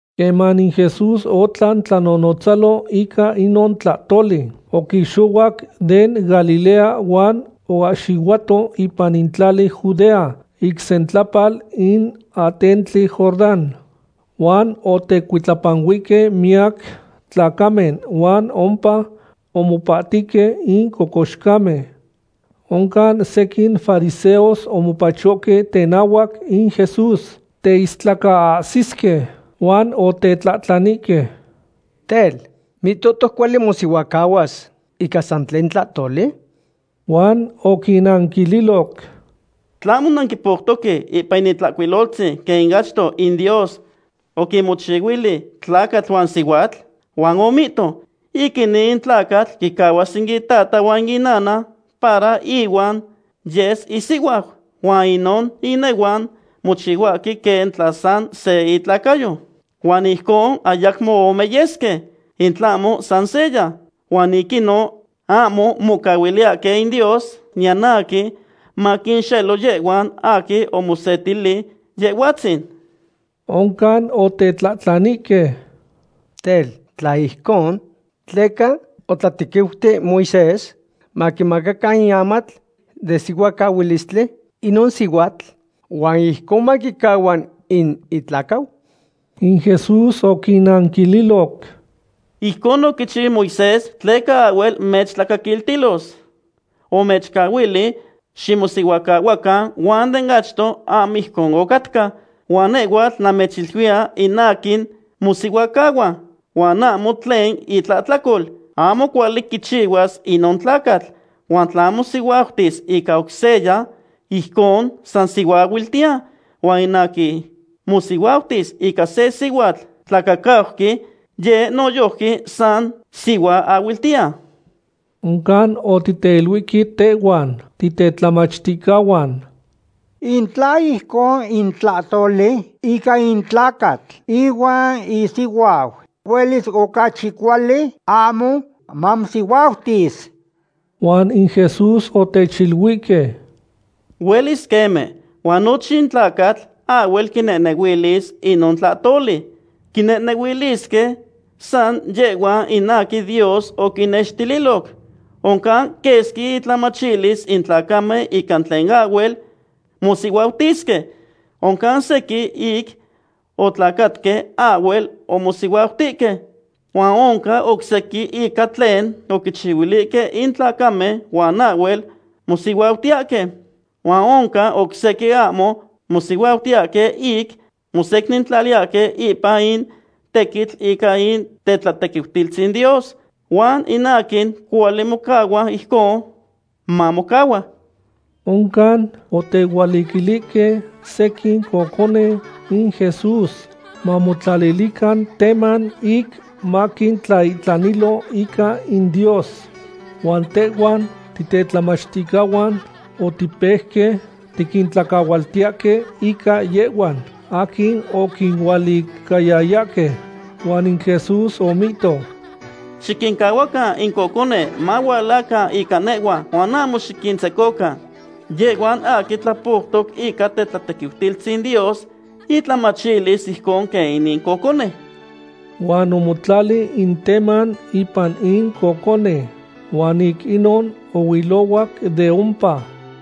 Queman in Jesús otlan tlanonotzalo ica inon tlahtoli, oquixohuac den Galilea huan oahxihuato ipan in tlali Judea ic sentlapal in atentli Jordán. Huan otecuitlapanuihque miyac tlacamen huan ompa omopahtihque in cocoxcamen. Oncan sequin fariseos omopachohque tenahuac in Jesús teistlacaahsisque, huan otetlahtlanihque: ―Tel, ¿mihtohtoc cuali mosihuacahuas ica san tlen tlahtoli? Huan oquinnanquililoc: ―¿Tlahmo nanquipoutoque ipan in Itlahcuiloltzin quen ic achto in Dios oquinmochihuili tlacatl huan sihuatl? Huan omihto: “Ic inin in tlacatl quicahuas in itata huan inana para ihuan yes isihuau, huan inon inehuan mochihuatihue quen tla san se intlacayo.” Huan ijcon ayacmo ome yesque, in tlahmo san seya. Huan ic inon ahmo mocahuiliyahque in Dios niyan aquin maquinxelo yehhuan aquin omosetili Yehhuatzin. Oncan otetlahtlanihque: ―Tel, ¿tla ijcon, tleca otlatequiuti in Moisés maquimaca in amatl den sihuacahuilistli inon sihuatl huan ijcon maquicahua in itlacau? In Jesús oquinanquililoc: ―Ijcon oquichiu in Moisés tleca ahhuel mechtlacaquiltilos. Omechcahuili ximosihuacahuacan, huan den achto ahmo ijcon ocatca. Huan nehhuatl namechiluiya in aquin mosihuacahua, huan ahmo tlen itlahtlacol, ahmo cuali quichihuas inon tlacatl. Huan tla mosihuautis ica oc seya, ijcon san sihuaahuiltiya. Huan in aquin mosihuautis ica se sihuatl tlacacauqui, yeh noyojqui san sihuaahuiltiya. Oncan otiteiluihque tehhuan titetlamachticahuan: ―In tla ijcon in tlahtoli ica in tlacatl ihuan isihuau, huelis ocachi cuali ahmo mamosihuautis. Huan in Jesús otechiluihque: ―Huelis queme, huan nochin tlacatl ahhuel quinehnehuilis inon tlahtoli. Quinehnehuilisque san yehhuan in aquin Dios oquinnextililoc. Oncan quesqui intlamachilis in tlacamen ica tlen ahhuel mosihuautisque. Oncan sequin ic otlacatque ahhuel omosihuautihque. Huan oncan oc sequin ica tlen oquichihuilihque in tlacamen huan ahhuel mosihuautiyahque. Huan oncan oc sequin ahmo mosihuautiyahque ic mosecnintlaliyahque ipan in tequitl ica in tetlatequiutilistzin Dios. Huan in aquin cuali mocahua ijcon, mamocahua. Oncan, otehualiquilihque sequin cocone in Jesús mamotlalilican tema ic maquintlaihtanilo ica in Dios. Huan tehhuan titetlamachticahuan otipejque tiquintlacahualtiyahque ica yehhuan aquin oquinualicayayahque. Huan in Jesús omihto: ―Xiquincahuacan in cocone mahualacan ica nehhua huan ahmo xiquintzecocan. Yehhuan aquin tlapoutoc ica tetlatequiutilistzin Dios intlamachilis ijcon quen inin cocone. Huan omotlali in teman ipan in cocone, huan ic inon ohuilohuac de ompa.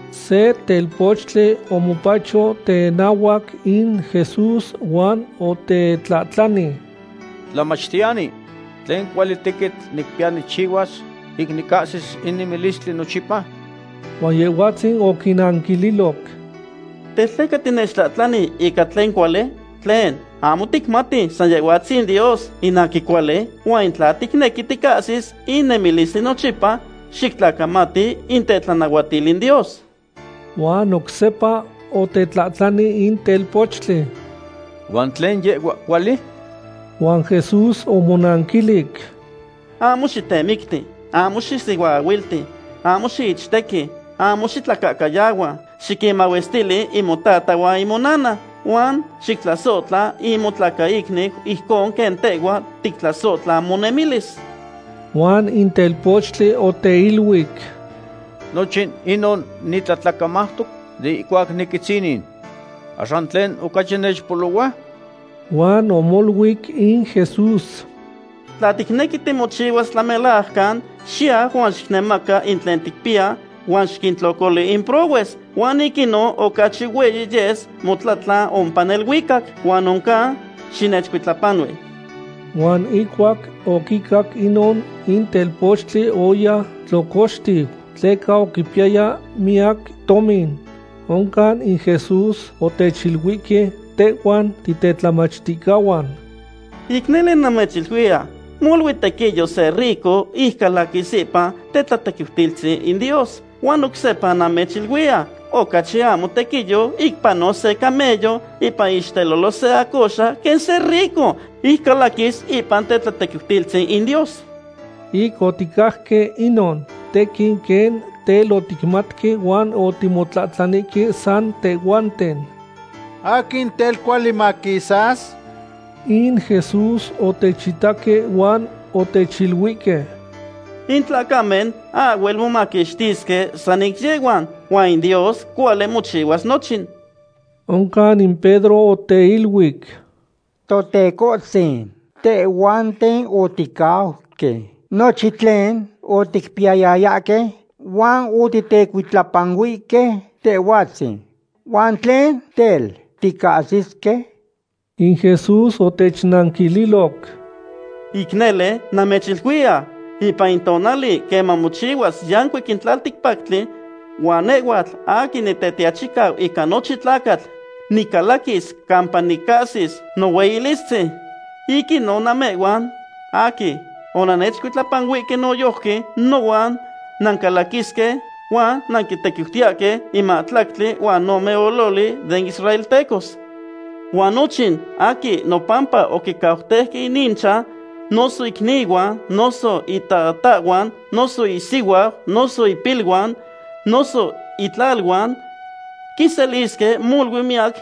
Se telpochtli omopacho tenahuac in Jesús huan otetlahtlani: ―Tlamachtiyani, ¿tlen cuali tequitl nicpiya nicchihuas ic nicahsis in nemilistli nochipa? Huan Yehhuatzin oquinanquililoc: ―Tel, ¿tleca tinechtlahtlani ica tlen cuali? Tlen, ¿ahmo ticmati san Yehhuatzin Dios in aquin cuali? Huan tla ticnequi ticahsis in nemilistli nochipa, xictlacamati in tetlanahuatil in Dios. Huan oc sepa otetlahtlani in telpochtli: ―¿Huan tlen yehhua cuali? Huan Jesús omonanquilic: ―Ahmo xitemicti; ahmo xisihuaahuilti; ahmo xiichtequi; ahmo xitlacahcayahua; xiquinmahuestili in motata huan monana; huan xictlasohtla in motlacaicniu ijcon quen tehhua tictlasohtla monemilis. Huan in telpochtli oteiluic: ―Nochin inon nitlatlacamautoc de ihcuac niquitzinin. ¿Axan tlen ocachi nechpolohua? Huan omoluic in Jesús: ―Tla ticnequi timochihuas tlamelajcan, xiyau huan xicnemaca in tlen ticpiya huan xiquintlocoli in prohues. Huan ic inon ocachi hueyi yes motlatlan ompa neluicac, huan oncan xinechcuitlapanui. Huan ihcuac oquicac inon, in telpochtli oya tlocoxtiu, tleca oquipiyaya miyac tomin. Oncan in Jesús otechiluihque tehhuan titetlamachticahuan: ―Ic nele, namechiluiya, molui tequiyo se rico ic calaquis ipan tetlatequiutilistzin in Dios. Huan oc sepa namechiluiya, ocachi ahmo tequiyo ic panos se camello ipan iixtelolo se acoxa quen se rico ic calaquis ipan tetlatequiutilistzin in Dios. Ic oticajque inon, tequin quen tel oticmatque huan otimotlahtlanihque san tehhuanten: ―¿Aquin tel cuali maquisas? In Jesús otechitaque huan otechiluihque: ―In tlacamen ahhuel momaquixtisque san ic yehhuan, huan Dios cuali mochihuas nochin. Oncan in Pedro oteiluic: ―Totecohtzin, tehhuanten oticauque nochin tlen oticpiyayahque, huan otitecuitlapanuihque Tehhuatzin. ¿Huan tlen, tel, ticahsisque? In Jesús otechnanquililoc: ―Ic nele, namechiluiya, ipan in tonali queman mochihua yancuic in tlalticpactli, huan nehhuatl aquin Nitetiachicau ica nochin tlacatl nicalaquis campa nicahsis nohueyilistzin, ic inon namehhuan aquin onannechcuitlapanuihque noyojqui nohuan nancalaquisque huan nanquintequiutiyahque in mahtlactli huan ome ololi den israeltecos. Huan nochin aquin nopampa oquincauteuque in ichan, noso icnihuan, noso itatahhuan, noso isihuau, noso ipiluan, noso itlaluan, quiselisque molui miyac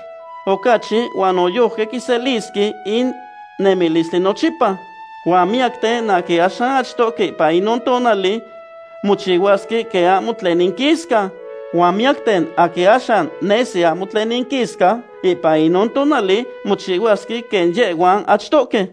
ocachi huan noyojqui quiselisque in nemilistli nochipa. Huan miyacten aquin axan achtohque ipan inon tonali mochihuasque quen ahmo tlen inquisca, huan miyacten aquin axan nesi ahmo tlen inquisca, ipan inon tonali mochihuasque quen yehhuan achtohque.